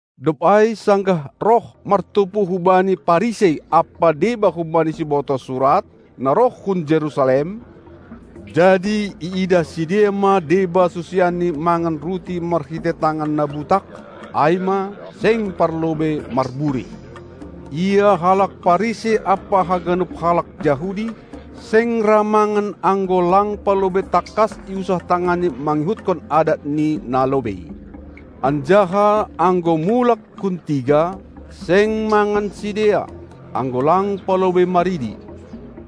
Dob ai, sanggah roh martumpu hu Bani Parisei ampa deba humbani sibotoh surat, na roh hun Jerusalem, jadi iidah sidea ma deba susianNi mangan ruti marhitei tangan na butak, ai ma, seng palobei marburih. Ia halak Parisei ampa haganup halak Jahudi, seng ra mangan anggo lang palobei tangkas iusah tanganni mangihutkon adat ni na lobei. Anjaha anggo mulak hun tiga, seng mangan sidea, anggo lang palobei maridi;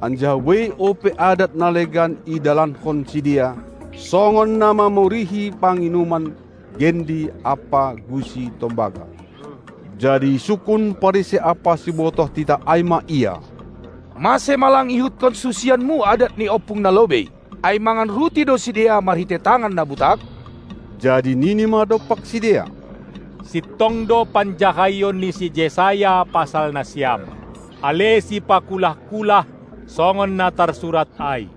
anjaha buei ope adat na legan idalankon sidea, songon na mamurihi panginuman, gendi ampa gusi tombaga. Jadi isungkun Parisei ampa sibotoh titah ai ma Ia: Mase ma lang iihutkon susianMu adat ni ompung na lobei, ai mangan ruti do sidea marhitei tangan na butak? Jadi nini ma dompak sidea: Sintong do panjahaion ni si Jesaya pasal nasiam, ale sipakulah-kulah, songon na tarsurat ai: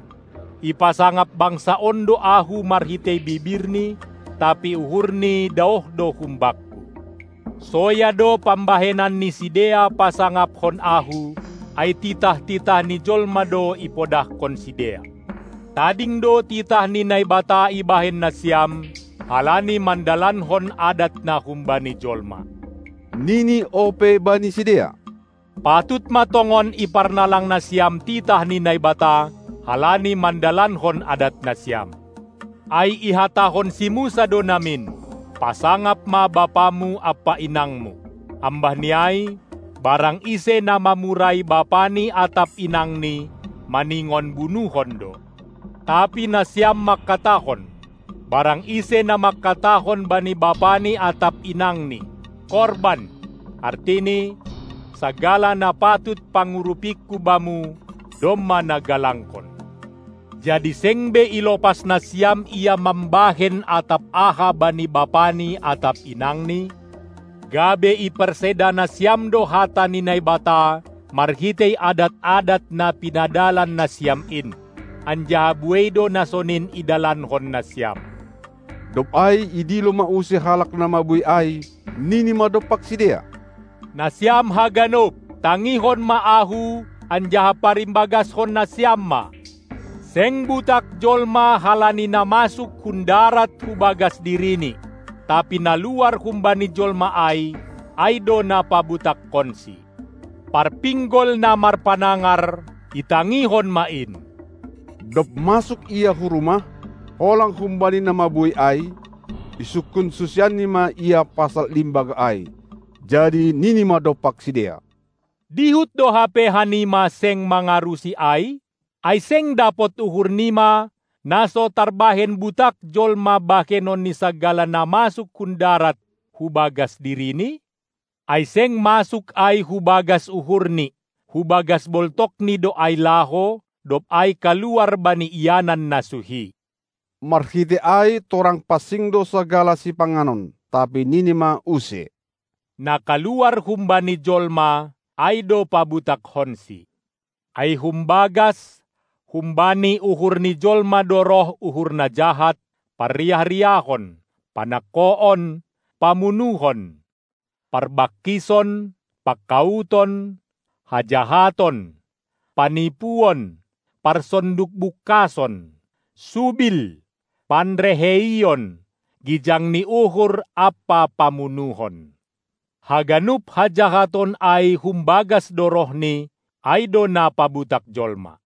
Ipasangap bangsa on do Ahu marhitei bibirni, tapi uhurni daoh do hum Bakku! Soya do pambahenan ni sidea pasangapkon Ahu, ai titah-titah ni jolma do ipodahkon sidea. Tading do titah ni Naibata ibahen nasiam, halani mandalankon adat na humbani jolma. Nini ope bani sidea: Patut ma tongon iparnalang nasiam titah ni Naibata, halani mandalankon adat nasiam. Ai ihatahon si Musa do namin: Pasangap ma bapamu ampa inangmu! Ambah ni ai: Barang ise na mamurai bapani atap inangni maningon bunuhon do. Tapi nasiam mangkatahon: Barang ise na mangkatahon bani bapani atap inangni: "Korban"! artini: Sagala na patut pangurupingku bamu, domma na galangkon. Jadi seng be ilopas nasiam ia mambahen atap aha bani bapani atap inangni, gabe iparseda nasiam do hata ni Naibata marhitei adat-adat na pinadalan nasiam in. Anjaha buei do na sonin idalankon nasiam. Dob ai idilo ma use halak na mabuei ai, nini ma dompak sidea: Nasiam haganup, tangihon ma Ahu anjaha parimbagaskon nasiam ma. Seng butak jolma halani na masuk hun darat hu bagas dirini, tapi na luar humbani jolma ai, ai do na pabutakkonsi. Parpinggol na marpanangar, itangihon ma in! Dob masuk Ia hu rumah, holang humbani na mabuei ai, isungkun susianNi ma Ia pasal limbaga ai. Jadi nini ma dompak sidea: Dihut do hape hanima seng mangarusi ai? Ai seng dapot uhur nima, na so tarbahen butak jolma bahenon ni sagala na masuk hun darat hu bagas dirini? Ai seng masuk ai hu bagas uhurni; hu bagas boltokni do ai laho, dob ai kaluar bani ianan na suhi. (Marhitei ai torang pansing do sagala sipanganon). Tapi nini ma use: Na kaluar humbani jolma, ai do pabutakkonsi. Ai humbagas, humbani uhurni jolma do roh uhur na jahat, parriah-riahon, panangkoon, pamunuhon, parbangkison, pangkauton, hajahaton, panipuon, parsondukbungkason, subil, panreheion, gijang ni uhur ampa pamunuhon. Haganup hajahaton ai humbagas do rohni, ai do na pabutak jolma.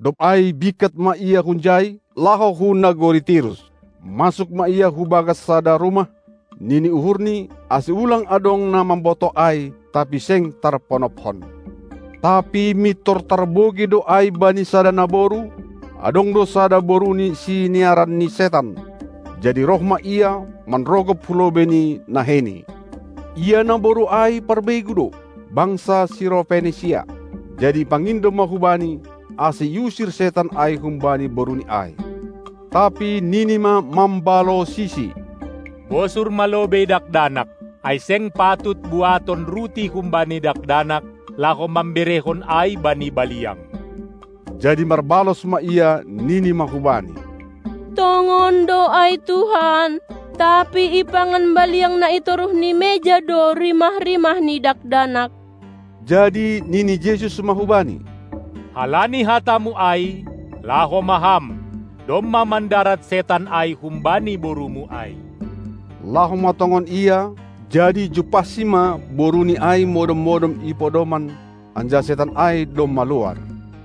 Dob ai bingkat ma Ia hunjai, laho hu nagori Tirus. Masuk ma Ia hu bagas sada rumah, nini uhurNi, ase ulang adong na mambotoh ai, tapi seng tarponopkon. Tapi mintor tarbogei do ai bani sada naboru, adong do sada boruni siniaran ni setan. Jadi roh ma ia, manrogop hu lobei ni naheiNi. Ia naboru ai, parbegu do, bangsa Sirofenisia, jadi ipangindo ma hu Bani, ase iusir setan ai humbani boruni ai. Tapi nini ma mambalosisi: Bosur ma lobei dakdanak; ai seng patut buaton ruti humbani dakdanak, laho mamberehon ai bani baliang. Jadi marbalos ma ia, nini ma hu Bani: Tongon do ai Tuhan, tapi ipangan baliang na i toruh ni meja do rimah-rimah ni dakdanak. Jadi nini Jesus ma hubani: Halani hatamu ai, laho ma ham, domma mandarat setan ai humbani borumu ai. Laho ma tongon ia, jadi jumpahsi ma boruni ai modom-modom i podoman, anjaha setan ai domma luar.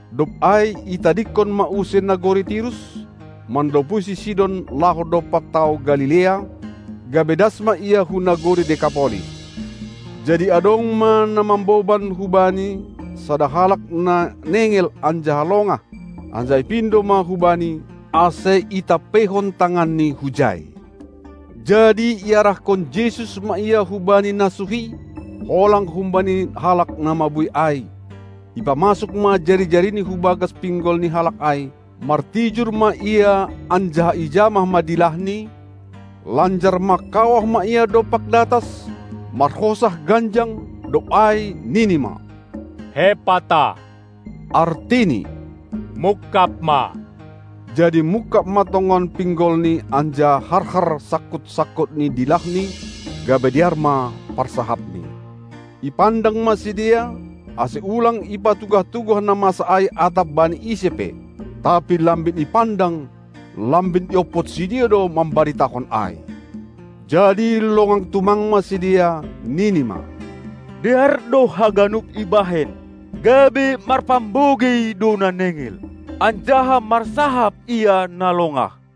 Dob ai itadingkon ma use nagori Tirus, manlopusi Sidon laho dompak tao Galilea, gabe das ma Ia hu nagori Dekapolis. Jadi adong ma na mamboban hu Bani sada halak na nengel anjaha longah, anjaha ipindo ma hu Bani, ase itampeihon tanganNi hujai. Jadi iarahkon Jesus ma ia hubani na suhi, holang humbani halak na mabuei ai; ipamasuk ma jari-jariNi hu bagas pinggol ni halak ai, martijur ma Ia anjaha ijamah ma dilahni, lanjar mangkawah ma Ia dompak datas, marhosah ganjang, dob ai nini ma: Hepata! artini: Mungkab ma! Jadi mungkab ma tongon pinggolni anjaha harhar sangkut-sangkut ni dilahni, gabe dear ma parsahapni. Ipandang ma sidea, ase ulang ipatugah-tugah na masa ai atap bani ise pe. Tapi lambin ipandang, lambin iompot sidea do mambaritahon ai. Jadi longang tumang ma sidea, nini ma: Dear do haganup ibahen: Gabe marpambogei do na nengel, anjaha marsahap ia na longah.